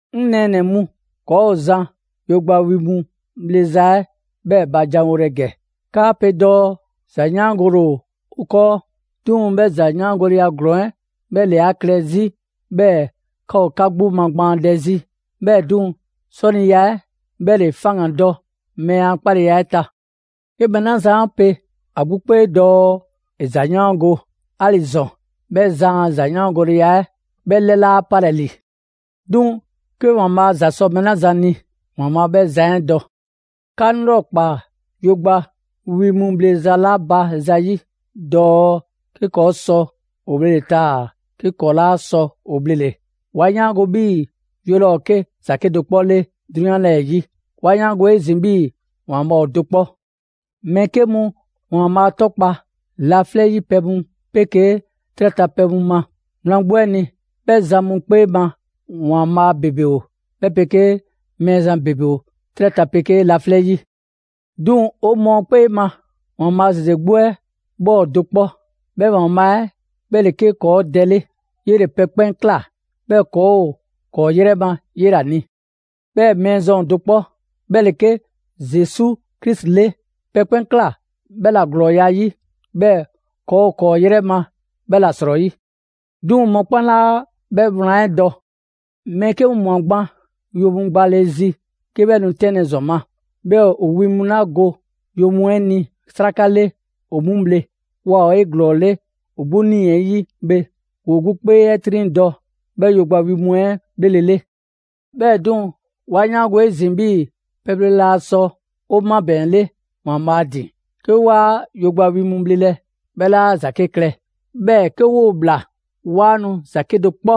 'Ŋ nɛɛnɛ‑ mu, ‑kɔɔ' zan yogba wi mu bhleza 'ɛ 'bhɛɛ‑ ba janwolɛ ‑gɛ. 'Kaa pe dɔɔ: «‑zayaangole ‑o 'o 'kɔɔ». 'Duŋ‑, 'bhɛ ‑zayaangoleya ‑glɔɔn 'ɛ 'bhɛ ‑le 'a klɛ 'zi 'bhɛɛ‑ 'ka ‑o 'ka 'gbu magbaandɛ 'zi, 'bhɛɛ‑ 'duŋ‑, 'sɔniya 'ɛ 'bhɛ ‑le faŋgandɔ mɛɛ a 'kpaleya 'ɛ ta. 'Ke mɛɛ 'la zan 'a pe ‑a 'gbu 'kpee dɔɔ ‑e ‑zayaango, 'ali‑ ‑zɔn, 'bhɛ zan a ‑zayaangoleya 'ɛ 'bhɛ 'lɛ 'laa 'palɛ‑ ‑li. 'Duŋ‑, 'ke ‑Waanbhaa' ‑za sɔ mɛɛ 'la zan ni, ‑Waanbhaa' 'bhɛ zan 'ɛ dɔ. 'Ka 'ŋ 'lrɔkpaa yogba wi mu bhleza 'la ba ‑zayi' dɔɔ 'ke ‑kɔɔ' sɔ ‑o bhlele‑ taa‑ 'ke ‑kɔɔ' 'laa sɔ ‑o bhlele‑. 'Wa 'yaango‑ 'bhii‑ yo laa ‑o 'ke ‑za 'kedo‑ 'kpɔ 'le 'drunyan 'lɛɛ‑ 'yi. 'Wa 'yaango‑ 'ezin‑ 'bhii‑ ‑Waanbhaa' ‑o do 'kpɔ. Mɛɛ 'ke mu ‑Waanbhaa' 'tɔkpa‑ laflɛ' 'yi pɛ mu 'pegee 'trɛ ta pɛ mu ma. Wlan 'gbu 'ɛ ni, 'bhɛ zan mu 'kpee ma, ‹‑waanbhaa'› ‑bebe ‑o, 'bhɛ 'pegee ‹mɛɛzan› ‑bebe ‑o 'trɛ ta 'pegee laflɛ' 'yi. 'Duŋ‑ 'o mɔɔ 'kpee ma, ‑Waanbhaa' ‑zeze 'gbu 'ɛ 'bhɛ ‑o do 'kpɔ: 'bhɛ ‑Waanbhaa' 'ɛ 'bhɛ ‑le 'ke ‑kɔɔ' Dɛ 'le. 'Yele‑ pɛ 'kpɛn ꞊kla, 'bhɛɛ‑ ‑kɔɔ' ‑o ‑kɔɔ' 'yrɛ ma 'yela‑ ni. 'Bhɛɛ‑ Mɛɛzan ‑o do 'kpɔ, 'bhɛ ‑le 'ke Zesu Krisi 'le. Pɛ 'kpɛn ꞊kla 'bhɛ ‑la ‑glɔɔya' 'yi, 'bhɛɛ‑ ‑kɔɔ' ‑o ‑kɔɔ' 'yrɛ ma 'bhɛ ‑la 'srɔyi. 'Duŋ‑ mɔkpɛn' 'laa 'bhɛ wlan 'ɛ dɔ. Mɛɛ 'ke mu ꞊mwa yo mu gbale zi 'ke 'bhɛ nu 'tɛnlɛ‑ ‑zɔn ma, 'bhɛɛ‑ ‑o wi mu 'la go yo mu 'ɛ ni 'sraka 'le, ‑o 'mu bhle. Waa ‑o 'eglɔɔle ‑o 'gbu 'nii‑ 'ɛ 'yi bhe, ‑woo 'gbu 'kpee 'ɛ 'triŋdɔ‑ 'bhɛ yogba wi mu 'ɛ 'bhlele‑ 'le. 'Bhɛɛ‑ 'duŋ‑, 'wa 'yaango‑ 'ezin‑ 'bhii‑ pɛbhle laa sɔ 'o 'mabɛɛnle ‑Waanbhaa' ‑din. 'Ke 'waa yogba wi mu bhlelɛ, 'bhɛ 'laa ‑za 'ke klɛ; 'bhɛɛ‑ 'ke 'woo‑ ꞊bhla, 'waa nu ‑za 'kedo‑ 'kpɔ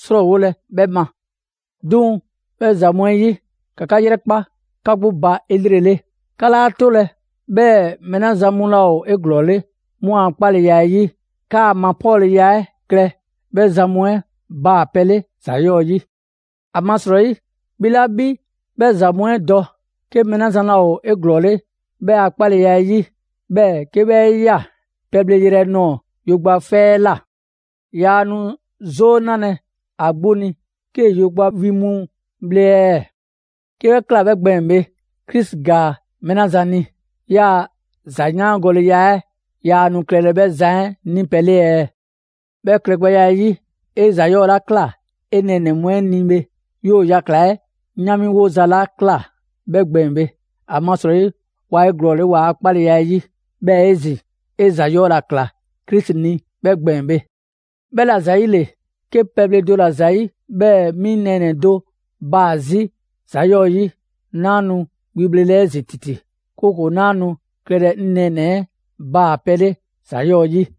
'srɔɔwolɛ 'bhɛ ma. 'Duŋ‑, 'bhɛ ‑za mu 'ɛ 'yi, ‑ka 'ka 'yrɛkpa 'ka 'gbu ba 'elrele. 'Ka 'laa 'tolɛ‑ 'bhɛɛ‑ mɛɛ 'la zan mu laa ‑o 'eglɔɔle 'mu a 'kpaleya 'ɛ 'yi, 'kaa‑ mapɔɔnleya 'ɛ klɛ 'bhɛ zan mu 'ɛ baa‑ pɛ 'le ‑za 'yɔɔ‑ 'yi. ‑Amasrɔyi, 'bhi 'la 'bhi 'bhɛ ‑za mu 'ɛ dɔ, 'ke mɛɛ 'la zan laa ‑o 'eglɔɔle 'bhɛ a 'kpaleya 'ɛ 'yi, 'bhɛɛ‑ 'ke 'bhɛ 'e ꞊ya pɛbhle yrɛ nɔɔ‑ yogba 'fɛ 'ɛ ꞊la; yaa nu 'zoo 'nalɛ‑ ‑a 'gbu ni 'kee‑ yogba wi mu bhle ɛɛ? 'Ke 'bhɛ ꞊kla 'bhɛ gbɛɛn‑ bhe, Krisi ‑gaa mɛɛ 'la zan ni, 'yaa‑ ‑zayaangoleya 'ɛ yaa nu klɛlɛ 'bhɛ zan 'ɛ 'ni pɛ 'le ɛɛ? 'Bhɛ klɛgbɛya 'ɛ 'yi, 'e ‑za 'yɔɔ‑ ‑la ꞊kla 'e nɛɛnɛ‑ mu 'ɛ ni bhe, 'yoo‑ yakla‑ 'ɛ 'yaanmiwoza ‑la ꞊kla 'bhɛ gbɛɛn‑ bhe, ‑amasrɔyi waa ‑o 'eglɔɔle waa 'kpaleya 'ɛ 'yi. 'Bhɛɛ‑ 'ezin‑ 'e ‑za 'yɔɔ‑ ‑la ‑kla Krisi ni 'bhɛ gbɛɛn‑ bhe. 'Bhɛla‑ ‑zayile, 'ke pɛbhle do ‑la ‑zayi' 'bhɛɛ‑ 'mi 'ŋ nɛɛnɛ‑ do baa‑ 'zi ‑za 'yɔɔ‑ 'yi, 'naa nu wi bhlelɛ 'ezin‑ ‑titi; 'kooko‑ 'naa nu klɛlɛ 'ŋ nɛɛnɛ‑ 'ɛ baa‑ pɛ 'le ‑za 'yɔɔ‑ 'yi.